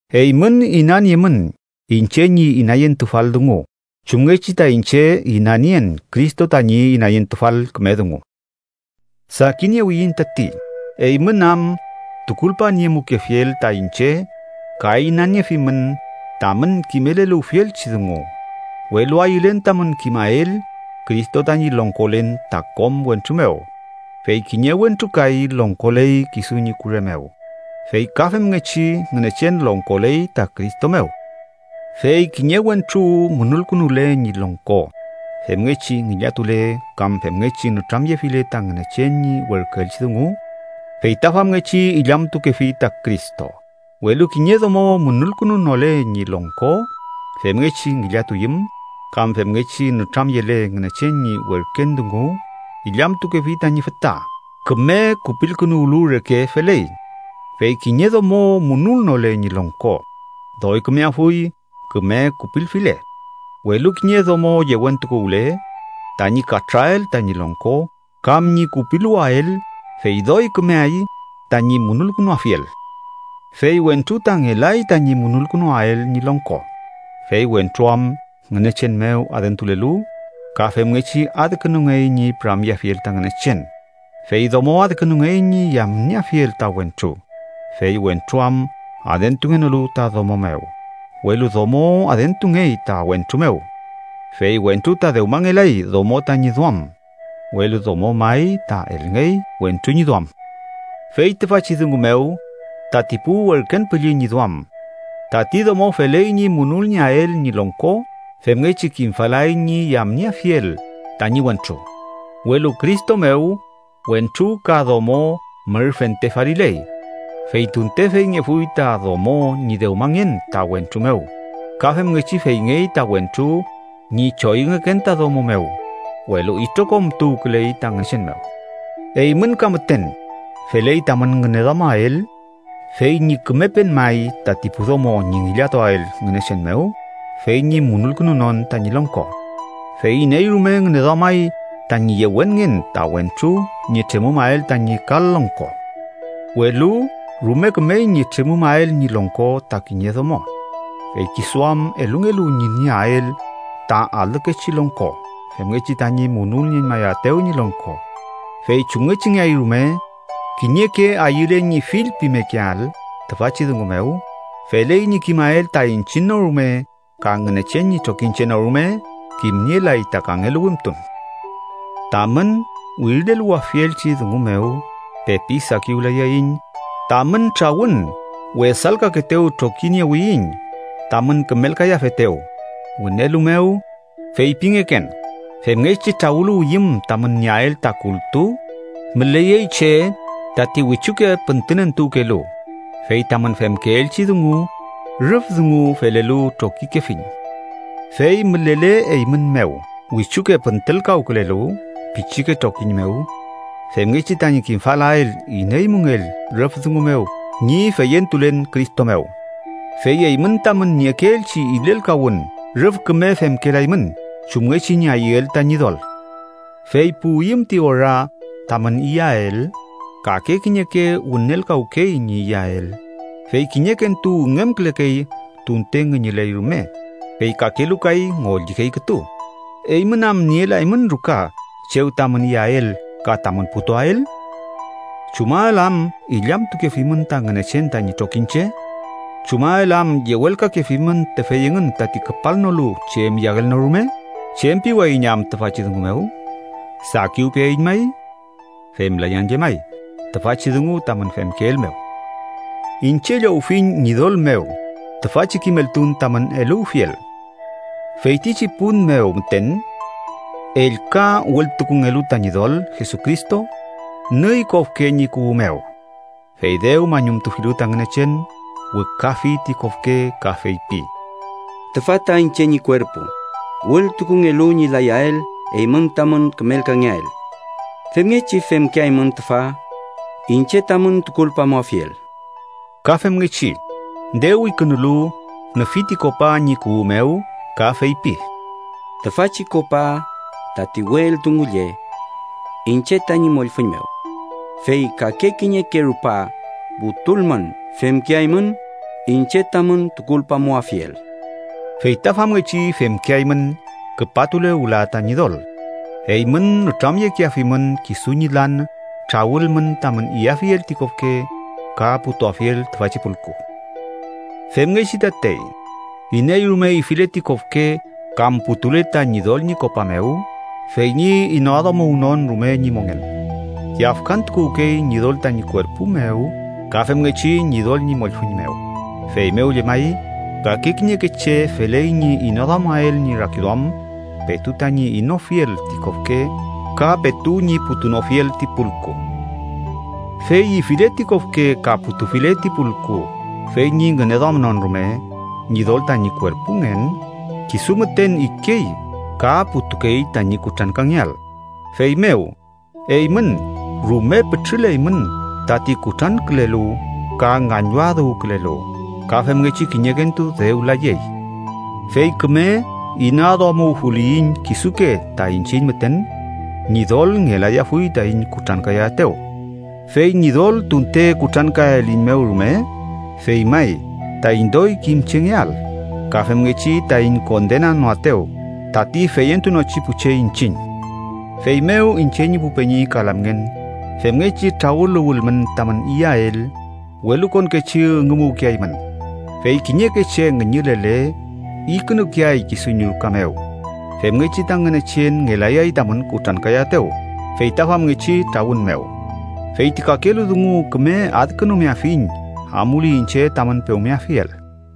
Eymün inaniemün iñche ñi inayentufal dungu chumngechi ta iñche inanien Cristo tañi inayentufal küme dungu. Sakiniewiyiñ tati, eymün am tukulpaniemukefiel ta iñche ka inaniefimün tamün kimeleluwfielchi dungu. Welu ayülen tamün kimael Cristo tañi longkolen ta kom wentru mew fey kiñe wentru kay longkoley kisu ñi kure mew, fey ka femngechi Ngünechen longkoley ta Cristo mew. Fey kiñe wentru munulkünule ñi longko femngechi ngillatule kam femngechi nütramyefile ta Ngünechen ñi werküelchi dungu, fey ta famngechi illamtukefi ta Cristo. Welu kiñe domo munulkünunole ñi longko femngechi ngillatuyüm kam femngechi nütramyele Ngünechen ñi werken dungu, illamtukefi tañi füta. Küme kupilkünuwlu reke feley. Fey kiñe domo munulnole ñi longko, doy kümeafuy küme kupilfile. Welu kiñe domo yewentukuwle tañi katrüael tañi longko kam ñi kupiluwael, fey doy kümeay tañi munulkünuafiel. Fey wentru ta ngelay tañi munulkünuwael ñi longko, fey wentru am Ngünechen mew adentulelu ka femngechi adkünungey ñi püramyeafiel ta Ngünechen, fey domo adkünungey ñi yamnieafiel ta wentru, fey wentru am adentungenolu ta domo mew, welu domo adentungey ta wentru mew. Fey wentru ta dewmangelay domo tañi duam, welu domo may ta elngey wentru ñi duam. Fey tüfachi dungu mew, tati pu werken püllü ñi duam, tati domo feley ñi munulnieael ñi longko femngechi kimfalay ñi yamnieafiel tañi wentru. Welu Cristo mew, wentru ka domo mür fente faliley, fey tunte feyngefuy ta domo ñi dewmangen ta wentru mew, ka femngechi feyngey ta wentru ñi choyüngeken ta domo mew, welu itrokom tuwküley ta Ngünechen mew. Eymün ka müten feley tamün ngüneduamael fey ñi kümepen may tati pu domo ñi ngillatuael Ngünechen mew fey ñi munulkünunon tañi longko. Fey iney rume ngüneduamay tañi yewenngen ta wentru ñi tremümael tañi kal longko. Welu rume kümey ñi tremümael ñi longko ta kiñe domo, fey kisu am elungelu ñi nieael ta alükechi longko femngechi tañi munulnieñmayaetew ñi longko. Fey chumngechingeay rume, kiñeke ayüle ñi fillpimekeael tüfachi dungu mew, feley ñi kimael ta iñchiñ no rume ka Ngünechen ñi trokiñche no rume kimnielay ta kangelu wimtun. Tamün wirileluwafielchi dungu mew pepi sakiwlayayiñ, tamün trawün wesalkakeetew trokiniewiyiñ, tamün kümelkayafetew. Wünelu mew, feypingeken femngechi trawüluwiyüm tamün nieael ta kultu, müleyey che tati wichuke püntünentuwkelu. Fey tamün femkeelchi dungu rüf dungu felelu trokikefiñ. ¡Fey mülele eymün mew wichuke püntülkawkülelu pichike trokiñ mew, femngechi tañi kimfalael iney müngell rüf dungu mew ñi feyentulen Cristo mew! Fey eymün tamün niekeelchi ilelkawün rüf küme femkelaymün chumngechi ñi ayüel ta Ñidol, fey puwiyüm ti ora tamün iyael, kake kiñeke wünelkawkey ñi iyael, fey kiñekentu üngümkülekey tunte ngüñüley rume, fey kakelu kay ngollikey kütu. ¿Eymün am nielaymün ruka chew tamün iyael ka tamün putuael? ¿Chumael am illamtukefimün ta Ngünechen tañi trokiñche? ¿Chumael am yewelkakefimün tüfey engün tati küpalnolu chem iyael no rume? ¿Chem piwayiñ am tüfachi dungu mew? ¿Sakiwpeaiñ may? ¡Femlayan llemay tüfachi dungu tamün femkeel mew! Iñche llowfiñ Ñidol mew tüfachi kimeltun tamün eluwfiel: Feytichi pun mew müten ellka wültukungelu ta Ñidol Jesucristo, nüy kofke ñi kuwü mew. Fey dew mañumtufilu ta Ngünechen, wükafi ti kofke ka feypi: “Tüfa ta iñche ñi kuerpu, wültukungelu ñi layael eymün tamün kümelkangeael. Femngechi femkeaymün tüfa iñche tamün tukulpamuafiel.” Ka femngechi, dew ikünulu, nüfi ti kopa ñi kuwü mew ka feypi: “Tüfachi kopa, tati we eldungu lle iñche tañi mollfüñ mew. Fey kake kiñeke rupa putulmün, femkeaymün iñche tamün tukulpamuafiel.” Fey ta famngechi femkeaymün, küpatule wüla ta Ñidol, eymün nütramyekeafimün kisu ñi lan trawülmün tamün iyafiel ti kofke ka putuafiel tüfachi pulku. Femngechi tatey, iney rume ifile ti kofke kam putule ta Ñidol ñi kopa mew fey ñi inaduamuwnon rume ñi mongen, yafkantukuwkey Ñidol tañi kuerpu mew ka femngechi Ñidol ñi mollfüñ mew. Feymew llemay, kake kiñeke che feley ñi inaduamael ñi rakiduam petu tañi inofiel ti kofke ka petu ñi putunofiel ti pulku. Fey ifile ti kofke ka putufile ti pulku fey ñi ngüneduamnon rume Ñidol tañi kuerpungen, kisu müten ikey ka putukey tañi kutrankangeael. Feymew, eymün rume pütrüleymün tati kutrankülelu ka ngañwadüwkülelu, ka femngechi kiñekentu dew layey. Fey küme inaduamuwfuliyiñ kisuke ta iñchiñ müten, Ñidol ngelayafuy taiñ kutrankayaetew. Fey Ñidol tunte kutrankaliyiñmew rume, fey may taiñ doy kimchengeael, ka femngechi taiñ kondenanoaetew tati feyentunochi pu che iñchiñ. Feymew, iñche ñi pu peñi ka lamngen, femngechi trawüluwülmün tamün iyael, welukonkechi üngümuwkeaymün. Fey kiñeke che ngüñülele, ikünukeay kisu ñi ruka mew, femngechi ta Ngünechen ngelayay tamün kutrankayaetew, fey ta famngechi trawün mew. Fey ti kakelu dungu küme adkünumeafiñ amuli iñche tamün pewmeafiel.